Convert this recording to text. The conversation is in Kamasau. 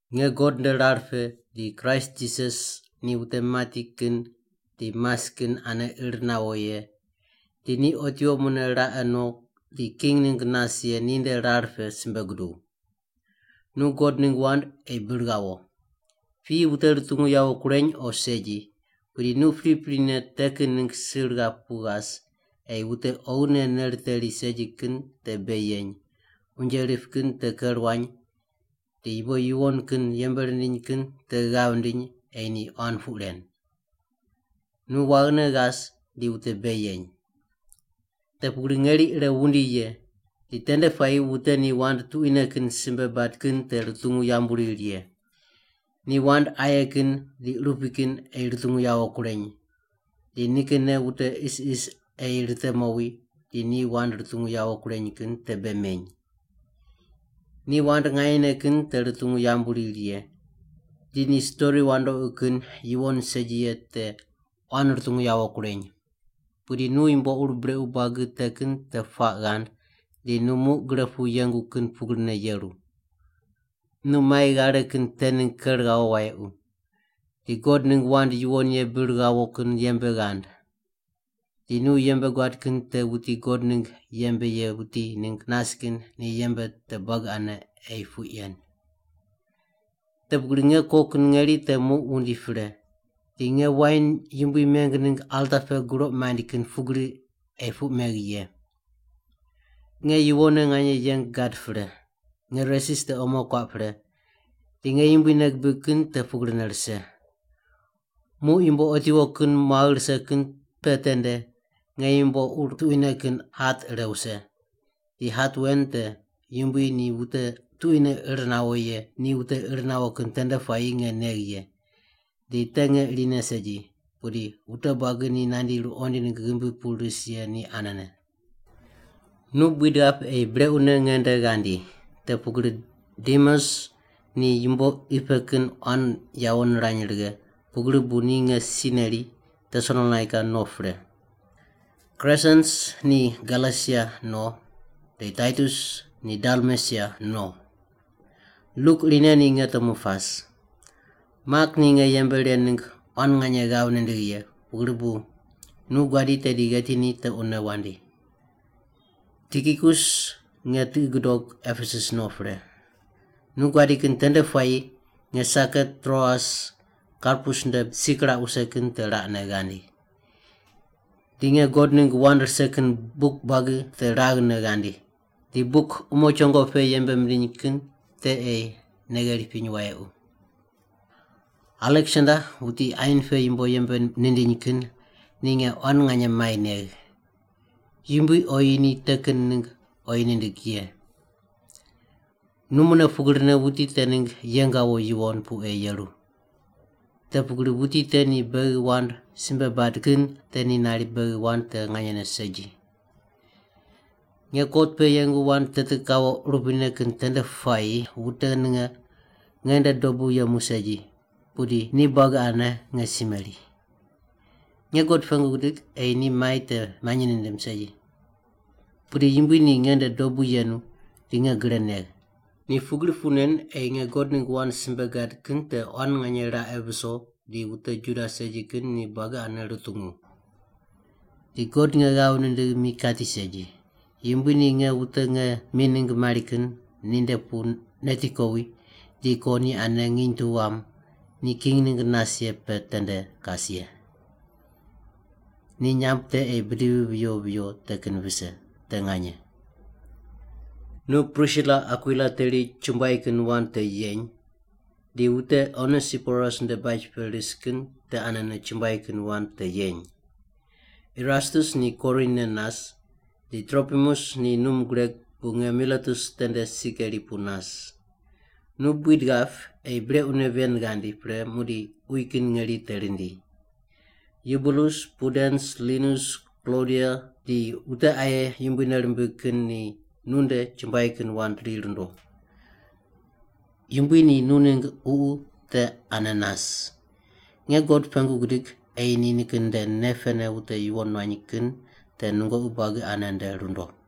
Nge God nde rar pe di Kraist Jisas ni wute mati kin di mas kin ane ir nawo ye di ni otiwo mune raqe no di king ningg nas ye ninde rar pe simbe guduw. Nu God ningg wand ei bir ghawo. Piyi wute rutungu yawo kureny o segi, pudi nu priprine te kin ningg sir ghap pu ghas ei wute oghine nei riteri segi kin te bei yeny, unje rip kin te ker wuany, di yumbo yuwon kin yembe rindiny kin te ghav ndiny ei ni quan puq ren. Nu waghine ghas di wute bei yeny. Te pugri ngeri ire wundi ye, di tende puayi wute ni wand tuquine kin simbe bad kin te rutungu yambu riri ye. Ni wand aye kin di urupui kin ei rutungu yawo kureny, di nikinne wute isis ei rite mowi di ni wand rutungu yawo kureny kin te bei meny. Ni wand nganyene kin te rutungu yambu riri ye, di ni stori wandoqi kin yuwon segi ye te quan rutungu yawo kureny. Pudi nu yumbo ur brequ buagi te kin te puaq ghand di nu muq gre pu yengu kin pugrine yeru. Nu mai ghare kin te ningg ker ghawo wayequ, di God ningg wand yuwon ye bir ghawo kin yembe ghand. Di nu yembe guad kin te wuti God ningg yembe ye wuti ningg nas kin ni yembe te buagi ane ei puq yen. Te pugri nge ko kin ngeri te muq wundi pre, di nge wain Yumbui meng ningg alta pe guroq maind kin pugri ei puq megh ye. Nge yuwonne nganye yeng gad pre. Nge resis te omo kuaq pre, di nge Yumbui nei gibig kin te pugrine rise. Muq yumbo otiwo kin muagh rise kin pe tende nge yumbo ur tuquine kin hat ire wuse, di hat wen te Yumbui ni wute tuquine ir nawo ye ni wute ir nawo kin tende puayi nge negh ye, di te nge irine segi, pudi wute buagi ni nandi ruqoind ningg ghimbi pu ris ye ni anene. Nu buid ghap ei brequne nge nde ghandi, te pugri Demas ni yumbo qi pe kin quan yawo nirany righe, pugri bu ni nge si neri Tesalonaika no pre. Kresens ni Galesia no, di Taitus ni Dalmesia no. Luk irine ni nge temu pas. Mak ni nge yembe ren ningg quan nganye ghav nindigh ye, pugri bu nu guadi tedi gheti ni tequne wandi. Tikikus nge tiqi gudoq Epesus no pre. Nu guadi kin tende puayi nge saket Troas, Karpus nde si kiraq wuse kin te raqne ghandi. Di nge God ningg wand rise kin buk buagi te raghne ghandi, di buk umo chongo pe yembe mindiny kin te ei nei gheri piny wayequ. Aleksander wuti ain pe yumbo yembe nindiny kin ni nge quan nganye mai negh. Yumbui oyi ni te kin ningg oyi nindig ye. Nu mune pugrine wuti te ningg yeng ghawo yuwon pu ei yeru. Te pugri wuti te ni beghi wand simbe bad kin te ni nari beghi wand te nganyene segi. Nge kot pe yengu wand teti kawo urupuine kin tende puayi wute ninge nge nde dobu yemu segi, pudi ni buagi ane nge si meri. Nge God pengu gidig ei ni mai te manyi nindim segi. Pudi Yumbui ni nge nde dobu yenu di nge gre negh. Ni pugri puq nen ei nge God ningg wand simbe gad kin te quan nganye raqe viso di wute Juda segi kin ni buagi ane rutungu. Di God nge ghav nindigh mi kati segi. Yumbui ni nge wute nge mi ningg mari kin ninde pu neti kowi di ko ni ane nginy tu wam ni king ningg nas ye pe tende kas ye. Ni nyamb te ei bidivi viyo viyo te kin vise. Te nganye. Nu Prisila Akwila teri chumbuai kin wand te yeny, di wute Onesiporus nde baj pe ris kin te anene chumbuai kin wand te yeny. Erastus ni Korin ne nas di Tropimus ni num gureg bu nge Miletus tende si keri pu nas. Nu buid ghap ei brequne ven ghandi pre muqdi uyi kin ngeri te rindi. Yubulus, Pudens, Linus, Klodia di wute aye Yumbui nei rimbig kin ni nunde chumbuai kin wand ri rundo. Yumbui ni nu ningg ququ te ane nas. Nge God pengu gidig ei ni nikin nde nei pene wute yuwon nuany kin te nungoqi buagi ane nde rundo.